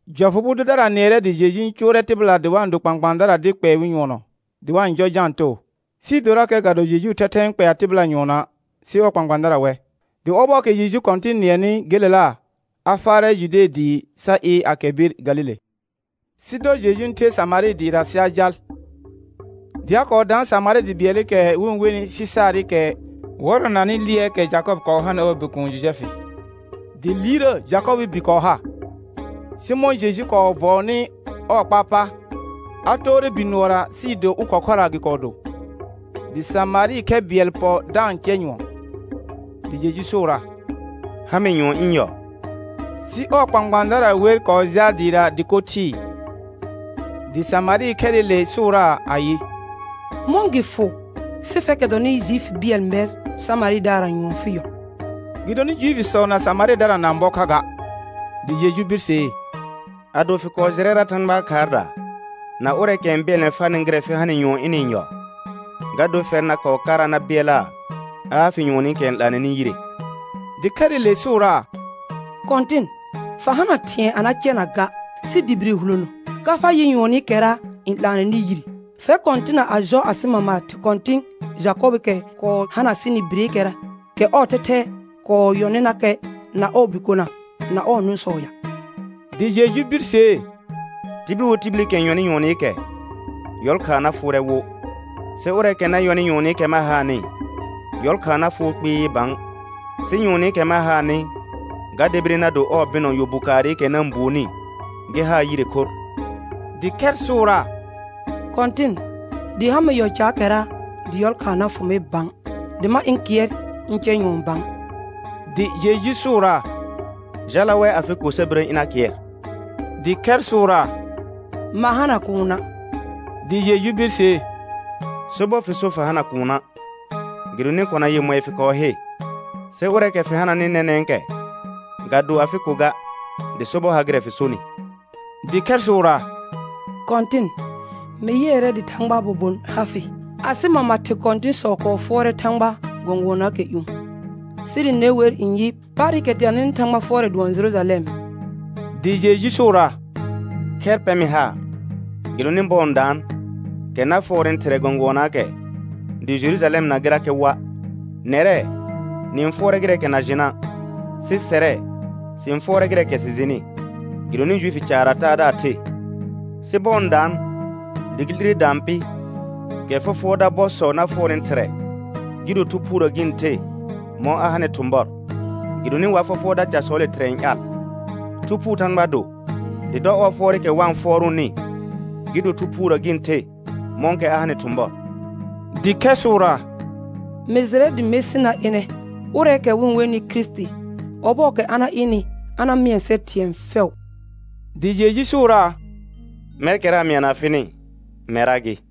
Jɔfʋ bʋ dʋdara nɩɛrɛ dɩ Jeju n cʋʋrɛ tɩbɩla dɩ wa-n do kpãkpãadara dɩ kpɛɛ wɩ nyʋɔnɔ, dɩ wa-n.jɔ Jãa too, sɩɩ dorakɛ ga do Jejuu thɛthɛ n kpɛa tɩbɩla nyuɔnɔa', sɩ ɔɔ kpãkpãadara wɛ. Dɩ ɔbɔɔkɛ Jeju Kɔ̃tɩn nɩɛnɩ gelela, a faarɛ Jude dɩɩ sa ɩɩr a kɛr bir Galile. Sɩ dɔ Jeju n the Samarɩ dɩɩra sɩ a jal. Dɩ a kɔɔ daan Samarɩ dɩ bɩɛlɩkɛ wɩ-n wenɩ Sɩsaarɩkɛ wɔrɔnanɩ lɩɛɛkɛ Jakɔbɩ kɔɔ hanɩ ɔɔ bikuun Jojɛfɩ. Dɩ liirrə Jakɔbɩɩ bi kɔɔ ha. Sɩ mɔ̃ Jeju kɔɔ vɔɔnɩ ɔɔ kpaar pa, a toore bi nʋɔra; sɩɩ do ʋlkhɔ khʋra gɩ kɔɔ do. Dɩ Samarɩ khɛ bɩɛl pɔ da-n cɛ nyʋɔn. Dɩ Jeju sʋʋraa: Ha mɩ nyʋɔn ɩ̃ yɔ. Sɩ ɔɔ kpãkpãadara wer kɔɔ jaal dɩɩra dɩko thɩɩ. Dɩ Samarɩ khɛrɩle sʋʋraa ayɩ: Mɔ̃ gɩ fʋ sɩ fɛrkɛ dɔnɩ Juifi bɩɛl mɛr Samarɩdaarra nyʋɔn fɩ yɔ? Gɩdonɩ Juifisɔ na Samarɩdara na-n bɔ kha ga. Dɩ Jeju birsee: Ado fɩ kɔɔ jɩrɛra Thãgbaa khaarda na ʋrɛɛkɛ n bɩɛlnɛ farnɩ gɩrɛ fɩ ha nɩ nyʋɔn ɩnɩ-n yɔ, ga dor fɛr na kɔɔ kara na bɩɛlaa a ha fɩ nyʋɔnɩkɛ n 'laanɛnɩ yire. Dɩ khɛrɩle sʋʋraa: Kɔ̃tɩn, fa hana thɩ̃ɛ a na cɛna ga, sɩ dɩ bire hulono. Ka fa yɩ nyʋɔnɩkɛra n 'laanɛnɩ yire? Fɛr kɔ̃tɩna a jɔ asɩ mama thɩ kɔ̃tɩ̃ Jakɔbɩɩkɛ kɔɔ hana sɩnɩ bireekɛra, kɛ ɔɔ thɛthɛra kɔɔ yɔnɩnakɛ na ɔɔ bikona na ɔɔ nʋ̃sɔ ya? Dɩ Jeju birsee: Tibil wo tibilikɛ n yɔnɩ nyʋɔnɩkɛ, yɔlkhaa na fʋʋrɛ wo. Sɩ ʋrɛɛkɛ na yɔnɩ nyʋɔnɩkɛ ma haanɩ, yɔlkhaa na fʋʋ kpɩɩ bã; sɩ nyʋɔnɩkɛ ma haanɩ ga debire na do ɔɔ bɩnɔ yɔ bu kaarɩkɛ na-n buonni gɩ haa yire khorr. Dɩ khɛr sʋʋraa: Kɔ̃tɩn, dɩ ha mɩ yɔ caakɛra dɩ yɔlkhaa na fʋ mɩ bã, dɩ ma ɩ̃ kɩɛr ɩ̃ eɛ nyʋɔn bã. Dɩ Jeju sʋʋraa: Jala wɛ afɩ ko sa birə ɩna kɩɛr. Dɩ khɛr sʋʋraa: Ma hana kuuna'; dɩ Jeju birsee: Sobɔr fɩ so fa hana kuuna'; gɩdonɩ kona yemɔɩ fɩ kɔɔ he, sɩ ʋrɛɛkɛ fɩ hananɩ nɛnɛ̃kɛ, ga do afɩ ko ga, dɩ sobɔr ha gɩrɛ fɩ sonɩ. Dɩ khɛr sʋʋraa: Kɔ̃tɩn, mɩ yɩɛrɛ dɩ Thãgbaa bobon ha fɩ. Asɩ mama thɩ kɔ̃tɩ̃sɔ kɔɔ fʋɔrɛ Thãgha gɔ̃gʋɔnaakɛ ƴũ, sɩ dɩ ne wer n yɩ: Paarɩkɛ teananɩ Thãgba fʋɔrɛ dʋɔn Jerujalɛm. Dɩ Jeju sʋʋraa: Khɛr pɛ mɩ haar, gɩdonɩ bɔɔ n daan, kɛ na fʋɔrnɩ Thɩrɛ gɔ̃gʋɔnaakɛ dɩ Jerujalɛmna gɩrakɛ woa'. Nɛrɛ, nɩ-n fʋɔrɛ gɩrɛɛkɛ na jɩna', sɩ sɛrɛ, sɩ-n fʋɔrɛ gɩrɛɛkɛ sɩ jɩnɩ, gɩdonɩ Juifii caarra Taadaar the. Sɩ bɔɔ n daan, dɩ gɩ 'lire daan pɩ, kɛ fɔfʋɔrda bɔsɔ na fʋɔrnɩ Thɩrɛ, gɩ do Thu Phuurə gɩ-n the mɔ̃ a hanɩ thʋ̃bɔr, gɩdonɩ wa fɔfʋɔrda casɔɔle Thɩrɛ n ƴaal. Thu Phuu Thãgba do, dɩ dɔ ɔɔ fʋɔrɩkɛ wa-n fʋɔrʋʋnɩ gɩ do Thu Phuurə gɩ-n the mɔ̃kɛ a hanɩ thʋ̃bɔr. Dɩ khɛr sʋʋraa: Mɩ jɩrɛ dɩ Mesɩ na ɩnɛ, ʋrɛɛkɛ wɩ-n wenɩ Kirisiti. Ɔbɔɔkɛ a na ɩnɩ a na mɩɛ sɛr thɩ̃ɛ fɛʋ. Dɩ Jeju sʋʋraa: Mɛrkɛra n mɩana fɩnɩ, mɛrra gɩ.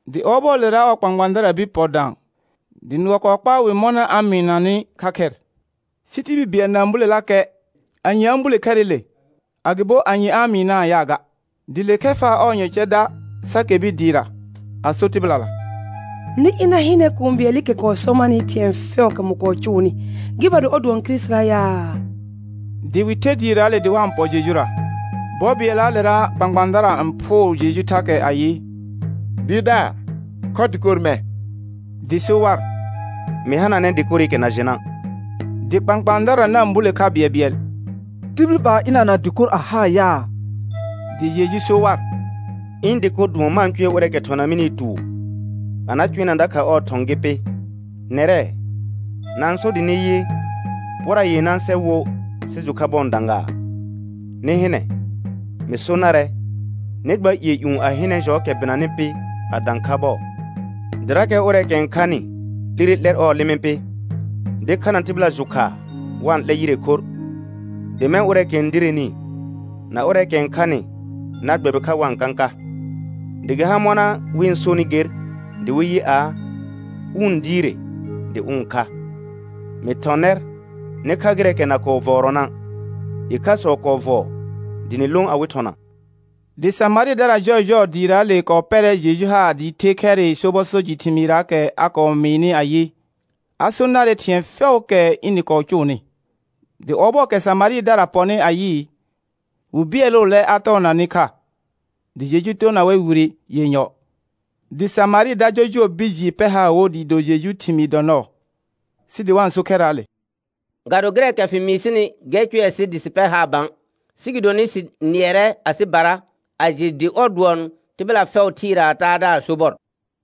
Dɩ ɔbɔɔlera ɔɔ kpãkpãadara bir pɔ dã, dɩ nʋɔ kɔɔ kpaa wɩ mɔna a-n mɩɩnanɩ kha khɛr. Sɩ tibil bɩɛl na-n bulelakɛ, anye a-n bule khɛrɩle, agɩbo anye a-n mɩɩnaa yaa ga. Dɩ le khɛr faa ɔɔ yɔ cɛ da sa kɛr bir dɩɩra, a so tɩbɩlala: Nɩ ɩna hɩnɛ kũu bɩɛlɩkɛ sɔ marnɩ thɩ̃ɛ fɛʋʋkɛ mɩ kɔɔ cʋʋnɩ, gɩ ba do ɔr dʋɔn Kirisitira yaa? Dɩ wɩ ther dɩɩraale dɩ wa n pɔ Jejura. Bɔ bɩɛllaalera kpãkpãadara n phʋʋr Jeju thakɛ ayɩ: Dɩɩrdaar, khɔ dɩkor mɛ̃. Dɩ so war: Mɩ hananɛ dɩkorɩkɛ na jɩna'. Dɩ kpãkpãadara na-n bule kha bɩɛlbɩɛl: Tibil ba ɩnana dɩkor a haa yaa? Dɩ Jeju so war: Ɩ̃ dɩko dʋɔn ma-n eʋɛ ʋrɛɛkɛ thɔna mɩnɩɩ tuur a na cʋɛna dakha ɔɔ thɔ̃ gɩ pɩ. Nɛrɛ, na-n so dɩ nɩ yɩ: Pora yenã sɛ wo sɩ jʋ kha bɔɔ n dã gaa? Nɩ hɩnɛ, mɩ so narɛ: Nɩ gba ƴɩɛ ƴũ a hɩnɛ jɔɔkɛ bɩnanɩ pɩ a dã kha bɔɔ. Dɩrakɛ ʋrɛɛkɛ n khanɩ 'lire 'lɛr ɔɔ lɩmɩ pɩ, dɩ khana tɩbɩla jʋ khaa wa-n 'lɛ yire khorr, dɩ mɛ̃ ʋrɛɛkɛ n direni na ʋrɛɛkɛ n khanɩ na gbɛbɩ kha wa-n kãka. Dɩ gɩ har mɔna wɩ-n sonɩ ger dɩ wɩ yɩ aa: Ʋ n diire dɩ ʋ n kha. Mɩ thɔ̃ nɛr nɩ kha gɩrɛɛkɛ na kɔɔ vɔɔrɔna', ɩkhasɔ kɔɔ vɔɔ dɩ nɩ lõ awɩ thɔna. Dɩ Samarɩdara jɔɔjɔɔ dɩɩraale kɔɔ pɛrɛ Jeju haar dɩɩ the khɛrɩ sobɔ so jɩ thɩmɩɩraakɛ a kɔɔ mɩɩnɩ ayɩ, a so narɛ thɩ̃ɛ fɛʋʋkɛ ɩnɩ kɔɔ cʋʋnɩ. Dɩ ɔbɔɔkɛ Samarɩdara pɔnɩ a yɩɩ, wɩ bɩɛlʋʋlɛ a tɔɔna nɩ kha, dɩ Jeju toona wɛr wire yenyɔ. Dɩ Samarɩda jɔjʋɔ bir jɩɩ pɛr haar wo dɩɩ do Jejuu thɩmɩɩ dɔ nɔɔ, sɩ dɩ wa-n so khɛrraale: Ga do gɩrɛɛkɛ fɩ mɩɩ sɩnɩ gɛr cʋɛ sɩ dɩ sɩ pɛr haar bã, sɩ gɩdonɩ sɩ nɩɛrɛ asɩbara a jɩ dɩ ɔr dʋɔn tɩbɩla fɛʋ thɩɩraa Taadaar sobɔr.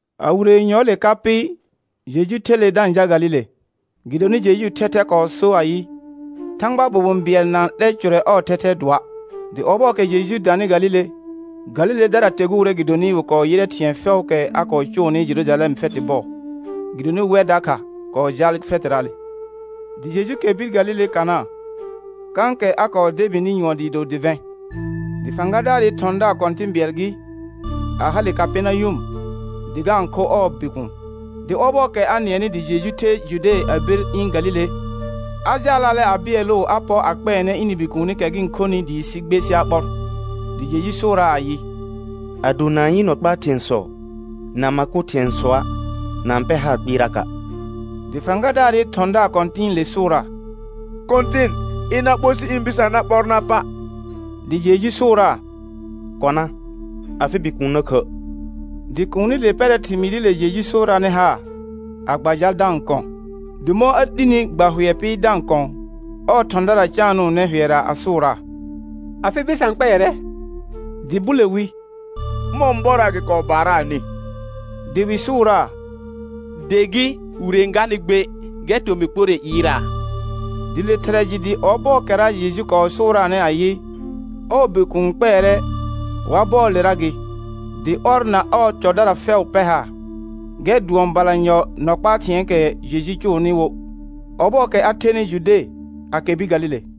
A wire yenyɔɔle ka pɩ, Jeju ther le da-n jal Galile. Gɩdonɩ Jejuu thɛthɛ kɔɔ sor ayɩ: Thãgbaa bobon bɩɛl na-n 'lɛ cʋrɛ ɔɔ thɛthɛɛ dʋɔa'. Dɩ ɔbɔɔkɛ Jeju danɩ Galile, Galiledara teguure gɩdonɩ wɩ kɔɔ yɩrɛ thɩ̃ɛ fɛʋʋkɛ a kɔɔ cʋunɩ Jerujalɛm fɛtɩ bɔɔ. Gɩdonɩ wɛr dakha kɔɔ jaal fɛtɩraale. Dɩ Jeju kɛr bir Galile Kana, kãkɛ a kɔɔ debini nyʋɔn dɩɩ do dɩvɛ̃. Dɩ fãgadaarɩ thɔ̃daar kɔ̃tɩ̃ bɩɛl gɩ, a hale Kapɛrnayʋm dɩ ga-n kho ɔɔ bikuun. Dɩ ɔbɔɔkɛ a nɩɛnɩ dɩ Jeju ther Jude a bir ɩ̃ Galile, a jaalaalɛ a bɩɛlʋʋ a pɔ a kpɛɛnɛ ɩnɩ bikuunikɛ gɩ-n khonɩ, dɩɩ sɩ gbe sɩ a ɓɔr. Dɩ Jeju sʋʋraa ayɩ: Ado na-n yɩ nɔ kpaa thɩ̃ɛsɔ na ma kʋ thɩ̃ɛsɔa', na-n pɛr haar kpɩɩraka'. Dɩ fãgadaarɩ thɔ̃daar kɔ̃tɩ̃ɩle sʋʋraa: Kɔ̃tɩn, ɩna ɓo sɩ ɩ̃ bɩsã na ɓɔr na pa'. Dɩ Jeju sʋʋraa: Kɔna, afɩ bikuun na khə'. Dɩ kuunile pɛrɛ thɩmɩɩrɩle Jeju sʋʋraanɩ haar, a gba jal da-n kɔ̃. Dɩ mɔ̃ a 'lini gba hʋɛ pɩ da-n kɔ̃, ɔɔ thɔ̃dara caanʋʋnɛ hʋɛra a sʋʋraa: Afɩ bɩsã kpɛɛrɛ. Dɩ bule wi: Ʋmɔ̃ bɔra gɩ kɔɔ baaraanɩ? Dɩ wɩ sʋʋraa: De gɩ wire n ganɩ gbe, gɛr tomɩ kporre ɩɩraa. Dɩ le thɩrɛ jɩ dɩ ɔbɔɔkɛra Jeju kɔɔ sʋʋraanɩ ayɩ, ɔɔ bikuun kpɛɛrɛ wa bɔɔlera gɩ, dɩ ɔr na ɔɔ cɔdara fɛʋ pɛr haar. Gɛr dʋɔn balanyɔ nɔ kpaa thɩ̃ɛɛkɛ Jeju cʋʋnɩ wo, ɔbɔɔkɛ a thenɩ Jude a kɛr bir Galile.